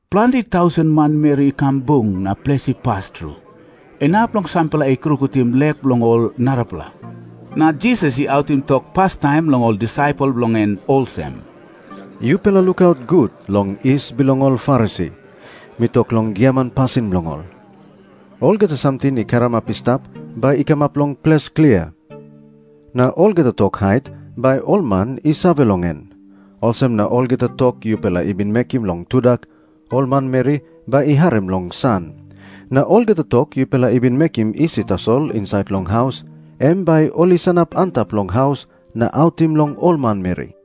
Planti tausen manmeri i kam bung na ples i pas tru, inap long sampela i krungutim lek bilong ol arapela. Na Jisas i autim tok pastaim long ol disaipel bilong en olsem, “Yupela lukaut gut long yis bilong ol Farisi. Mi tok long giaman pasin bilong ol. Olgeta samting i karamap i stap bai i kamap long ples klia. Na olgeta tok hait bai ol man i save long en. Olsem na olgeta tok yupela i bin mekim long tudak, ol manmeri bai i harim long san. Na olgeta tok yupela i bin mekim isi tasol insait long haus, em bai ol i sanap antap long haus na autim long ol manmeri.”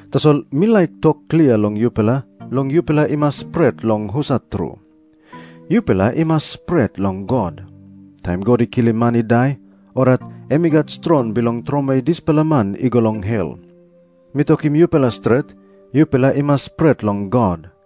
Tasol mi laik tok klia long yupela long yupela i mas pret long husat tru. Yupela i mas pret long God. Taim God i kilim man i dai, orait em i gat strong bilong tromoi dispela man i go long hel. Mi tokim yupela stret, yupela i mas pret long God.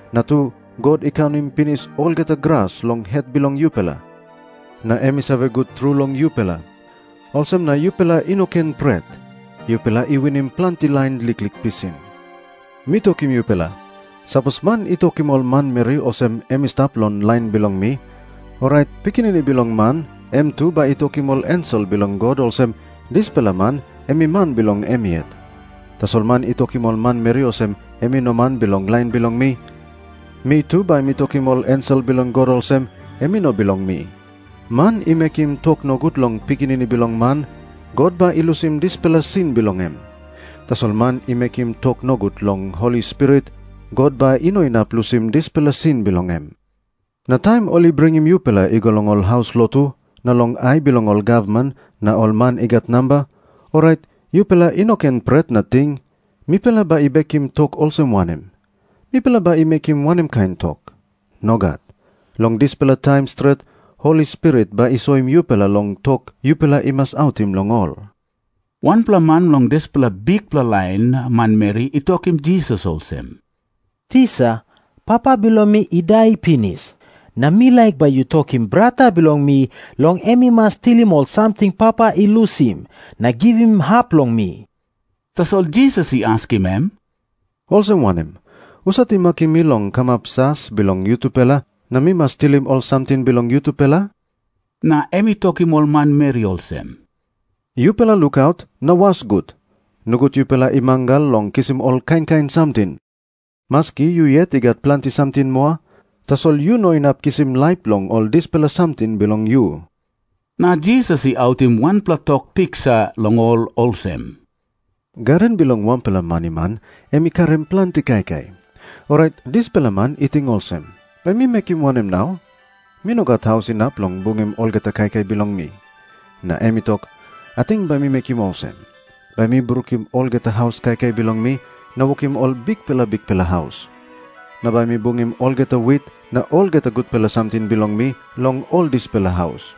Na tu, God i kaunim pinis olgeta gras long het bilong yupela, na em i save gut tru long yupela. Olsem na yupela i no ken pret. Yupela i winim planti lain liklik pisin.” Jisas i tok moa olsem, “Mi tokim yupela, sapos man i tokim ol manmeri olsem em i stap long lain bilong mi, orait Pikinini Bilong Man em tu bai i tokim ol ensel bilong God olsem dispela man em i man bilong em yet. Tasol man i tokim ol manmeri olsem em i no man bilong lain bilong mi, mi tu bai mi tokim ol ensel bilong God olsem em i no bilong mi. “Man i mekim tok nogut long Pikinini Bilong Man, God bai i lusim dispela sin bilong em. Tasol man i mekim tok nogut long Holi Spirit, God bai i no inap lusim dispela sin bilong em. “Na taim ol i bringim yupela i go long ol haus lotu na long ai bilong ol gavman na ol man i gat namba, orait yupela i no ken pret na ting, ‘Mipela bai i bekim tok olsem wanem? Mipela bai i mekim wanem kain tok?’ Nogat. Long dispela taim stret Holi Spirit bai i soim yupela long tok yupela i mas autim long ol.” Wanpela man long dispela bikpela lain manmeri i tokim Jisas olsem, “Tisa, papa bilong mi i dai pinis, na mi laik bai yu tokim brata bilong mi long em i mas tilim ol samting papa i lusim, na givim hap long mi.” Tasol Jisas i askim em, “Olsem wanem? Husat i makim mi long kamap jas bilong yutupela, na mi mas tilim ol samting bilong yutupela?” Na em i tokim ol manmeri olsem, “Yupela lukaut na was gut. Nogut yupela i mangal long kisim ol kain kain samting. Maski yu yet yu gat planti samting moa, tasol yu no inap kisim laip long ol dispela samting bilong yu.” Na Jisas i autim wanpela tok piksa long ol olsem, “Gaden bilong wanpela maniman em i karim planti kaikai. Orait dispela man i ting olsem, ‘Bai mi mekim wanem nau? Mi no gat haus inap long bungim olgeta kaikai bilong mi.’ Na em i tok, ‘Ating bai mi mekim olsem. Bai mi brukim olgeta haus kaikai bilong mi, na wokim ol bikpela bikpela haus. Na bai mi bungim olgeta wit na olgeta gutpela samting bilong mi long ol dispela haus.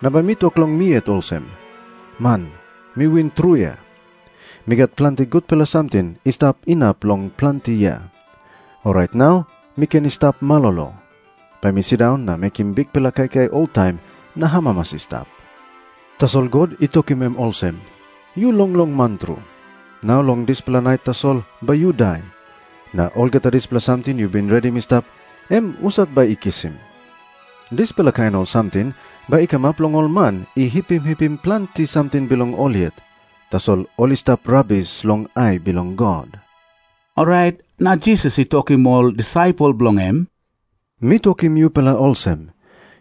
Na bai mi tok long mi yet olsem. Man, mi win tru ya. Mi gat planti gutpela samting i stap inap long planti yia. Orait nau mi ken i stap malolo. Bai mi sindaun na mekim bikpela kaikai oltaim na amamas i stap.’ Tasol God i tokim em olsem, ‘Yu longlong man tru. Nau long dispela nait tasol bai yu dai. Na olgeta dispela samting yu bin redim i stap, em husat bai i kisim?’” Na Jisas i tok, “Dispela kain samting bai i kamap long ol man i hipim hipim planti samting bilong ol yet, tasol ol i stap rabis long ai bilong God.” Orait na Jisas i tokim ol disaipel bilong en, “Mi tokim yupela olsem,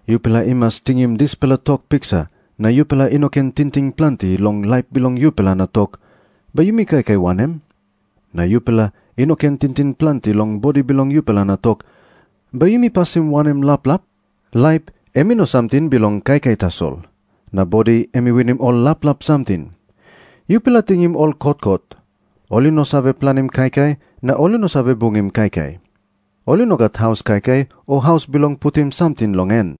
yupela i mas tingim dispela tok piksa na yupela i no ken tingting planti long laip bilong yupela, na tok, ‘Bai yumi kaikai wanem?’ Na yupela i no ken tingting planti long bodi bilong yupela na tok, ‘Bai yumi pasim wanem laplap?’ Laip em i no samting bilong kaikai tasol. Na bodi em i winim ol laplap samting. Yupela tingim ol kotkot. Ol i no save planim kaikai na ol i no save bungim kaikai. Ol i no gat haus kaikai o haus bilong putim samting long en.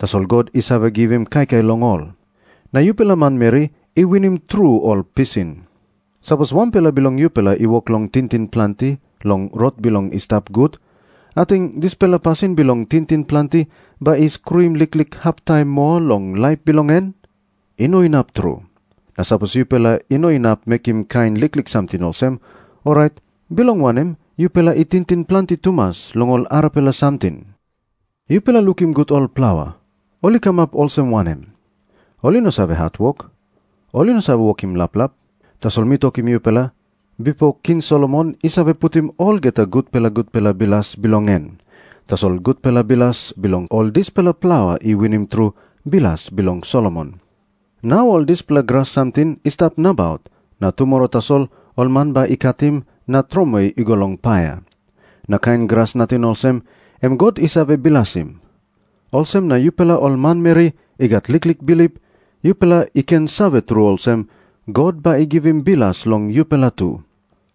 Tasol God i save givim kaikai long ol. Na yupela manmeri i winim tru ol pisin. Sapos wanpela bilong yupela i wok long tingting planti long rot bilong i stap gut, ating dispela pasin bilong tingting planti bai i skruim liklik hap taim moa long laip bilong en? I no inap tru. Na sapos yupela i no inap mekim kain liklik samting olsem, orait bilong wanem yupela i tingting planti tumas long ol arapela samting? “Yupela lukim gut ol plaua, ol i kamap olsem wanem. Ol i no save hatwok. Ol i no save wokim laplap. Tasol mi tokim yupela, bipo King Solomon i save putim olgeta gutpela gutpela bilas bilong en, tasol gutpela bilas bilong ol dispela plaua i winim tru bilas bilong Solomon. Nau ol dispela gras samting i stap nabaut na tumora tasol ol man bai i katim na tromoi i go long paia. Na kain gras nating olsem, em God i save bilasim. Olsem na yupela ol manmeri i gat liklik bilip, yupela i ken save tru olsem, God bai i givim bilas long yupela tu.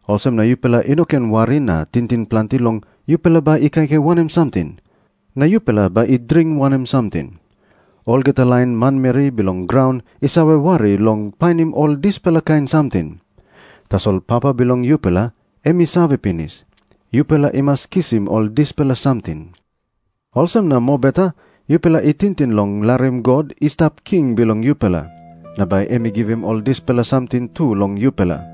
Olsem na yupela i no ken wari na tingting planti long yupela bai i kaikai wanem samting, na yupela bai i dring wanem samting. Olgeta lain manmeri bilong graun i save wari long painim ol dispela kain samting. Tasol Papa bilong yupela em i save pinis, yupela i mas kisim ol dispela samting. Olsem na mobeta yupela i tingting long larim God i stap king bilong yupela. Na bai em i givim ol dispela samting tu long yupela.”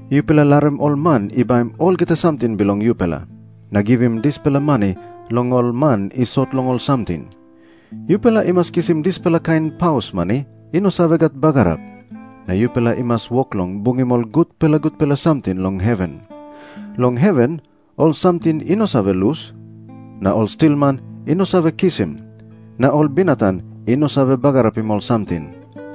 Yupela larim ol man i baim olgeta samting bilong yupela, na givim dispela mani long ol man i sot long ol samting. Yupela i mas kisim dispela kain paus mani i no save bagarap, na yupela i mas wok long bungim ol gutpela gutpela samting long heven. Long heven ol samting i no save lus, na ol stilman i no save kisim, na ol binatang i no save bagarapim ol samting.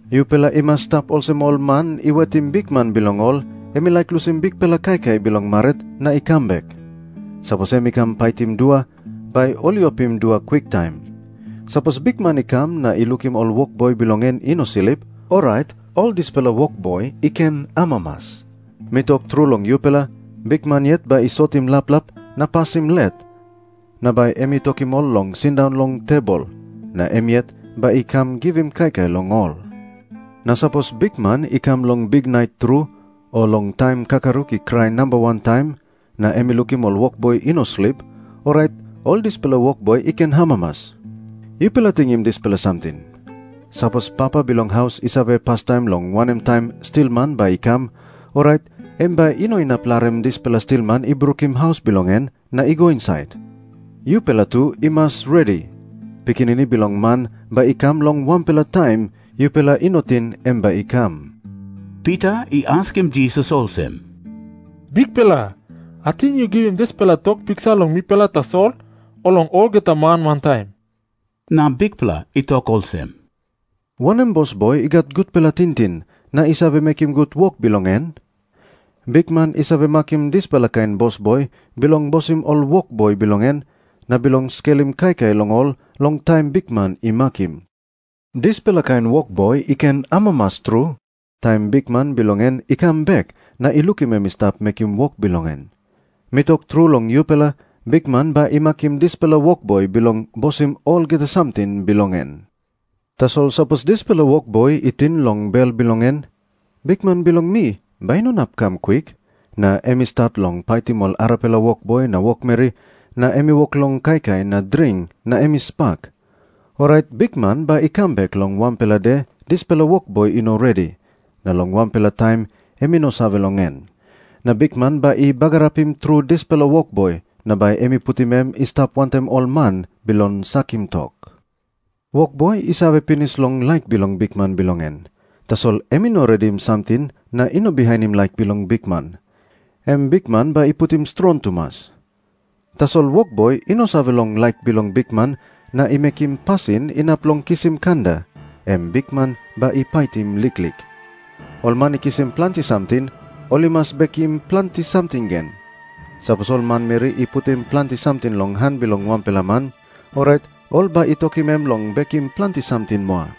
Yupela i mas i stap olsem ol man i wetim bikman bilong ol em i laik lusim bikpela kaikai bilong marit na i kam bek. Sapos em i kam paitim dua, bai ol i opim dua kwiktaim. Sapos bikman i kam na i lukim ol wokboi bilong en i no slip, orait ol dispela wokboi i ken amamas. Mi tok tru long yupela, bikman yet bai i sotim laplap na pasim let, na bai em i tokim ol long sindaun long tebol. Na em yet bai i kam givim kaikai long ol. Na sapos bikman i kam long biknait tru, o long taim kakaruk i krai namba wan taim, na em i lukim ol wokboi i no slip, orait ol dispela wokboi i ken amamas. “Yupela tingim dispela samting. Sapos papa bilong haus i save pastaim long wanem taim stilman bai i kam, orait em bai i no inap larim dispela stilman i brukim haus bilong en na i go insait. Yupela tu i mas redi. Pikinini Bilong Man bai i kam long wanpela taim yupela i no ting em bai i kam.” Pita i askim Jisas olsem, “Bikpela, ating yu givim dispela tok piksa long mipela tasol, o long olgeta man wantaim?” Na Bikpela i tok olsem, “Wanem bosboi i gat gutpela tingting, na i save mekim gut wok bilong en? Bikman i save makim dispela kain bosboi bilong bosim ol wokboi bilong en, na bilong skelim kaikai long ol long taim bikman i makim. Dispela kain wokboi i ken amamas tru taim bikman bilong en i kam bek na i lukim em i stap mekim wok bilong en. Mi tok tru long yupela, bikman bai i makim dispela wokboi bilong bosim olgeta samting bilong en. Tasol sapos dispela wokboi i ting long bel bilong en, ‘Bikman bilong mi bai i no inap i kam kwik,’ na em i stat long paitim ol arapela wokboi na wokmeri, na em i wok long kaikai na dring na em i spak, orait bikman bai i kam bek long wanpela de dispela wokboi i no redi, na long wanpela taim em i no save long en. Na bikman bai i bagarapim tru dispela wokboi, na bai em i putim em i stap wantaim ol man bilong sakim tok. “Wokboi i save pinis long laik bilong bikman bilong en, tasol em i no redim samting na i no bihainim laik bilong bikman, em bikman bai i paitim strong tumas. Tasol wokboi i no save long laik bilong bikman na i mekim pasin inap long kisim kanda, em bikman bai i paitim liklik. Ol man i kisim planti samting, ol i mas bekim planti samting gen. Sapos ol manmeri i putim planti samting long han bilong wanpela man, orait ol bai i tokim em long bekim planti samting moa.”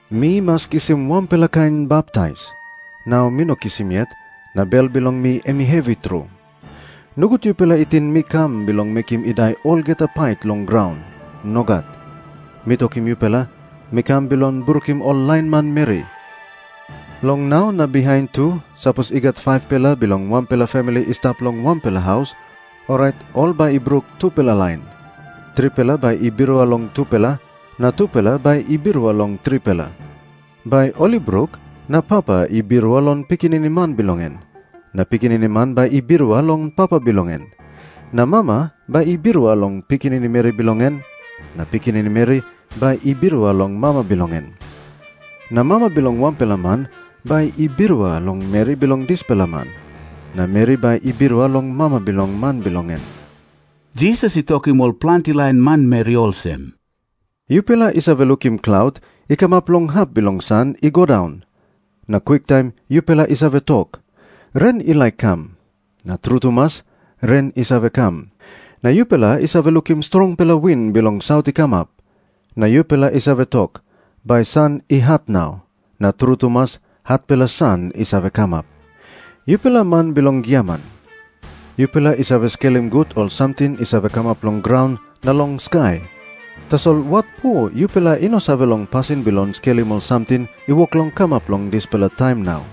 Mi mas kisim wanpela kain baptais. Nau mi no kisim yet, na bel bilong mi em i hevi tru. Nogut yupela i ting mi kam bilong mekim i dai olgeta pait long graun. Nogat. Mi tokim yupela, mi kam bilong brukim ol lain manmeri. Long nau na bihain tu sapos i gat 5-pela bilong wanpela famili i stap long wanpela haus, orait ol bai i bruk tupela lain. Tripela bai i birua long tupela, na tupela bai i birua long tripela. Bai ol i bruk, na papa i birua long pikinini man bilong en, na pikinini man bai i birua long papa bilong en. Na mama bai i birua long pikinini meri bilong en, na pikinini meri bai i birua long mama bilong en. Na mama bilong wanpela man bai i birua long meri bilong dispela man, na meri bai i birua long mama bilong man bilong en.” Jisas i tokim ol planti lain manmeri olsem, “Yupela i save lukim klaut i kamap long hap bilong san i go daun, na kwiktaim yupela i save tok, ‘Ren i laik i kam.’ Na tru tumas, ren i save kam. Na yupela i save lukim strongpela win bilong saut i kamap, na yupela i save tok, ‘Bai san i hat nau.’ Na tru tumas, hatpela san i save kamap. Yupela man bilong giaman, yupela i save skelim gut ol samting i save kamap long graun na long skai. Tasol watpo yupela i no save long pasin bilong skelim ol samting i wok long kamap long dispela taim nau?”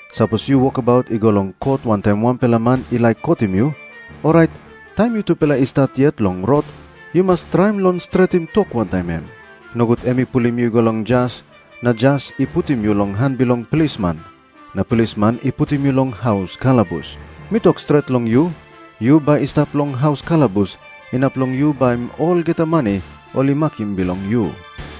Sapos yu wokabaut i go long kot wantaim wanpela man i laik kotim yu, orait taim yutupela i stap yet long rot yu mas traim long stretim tok wantaim em. Nogut em i pulim yu i go long jas, na jas i putim yu long han bilong plisman, na plisman i putim yu long haus kalabus. Mi tok stret long yu, yu bai i stap long haus kalabus inap long yu baim olgeta mani ol i makim bilong yu.”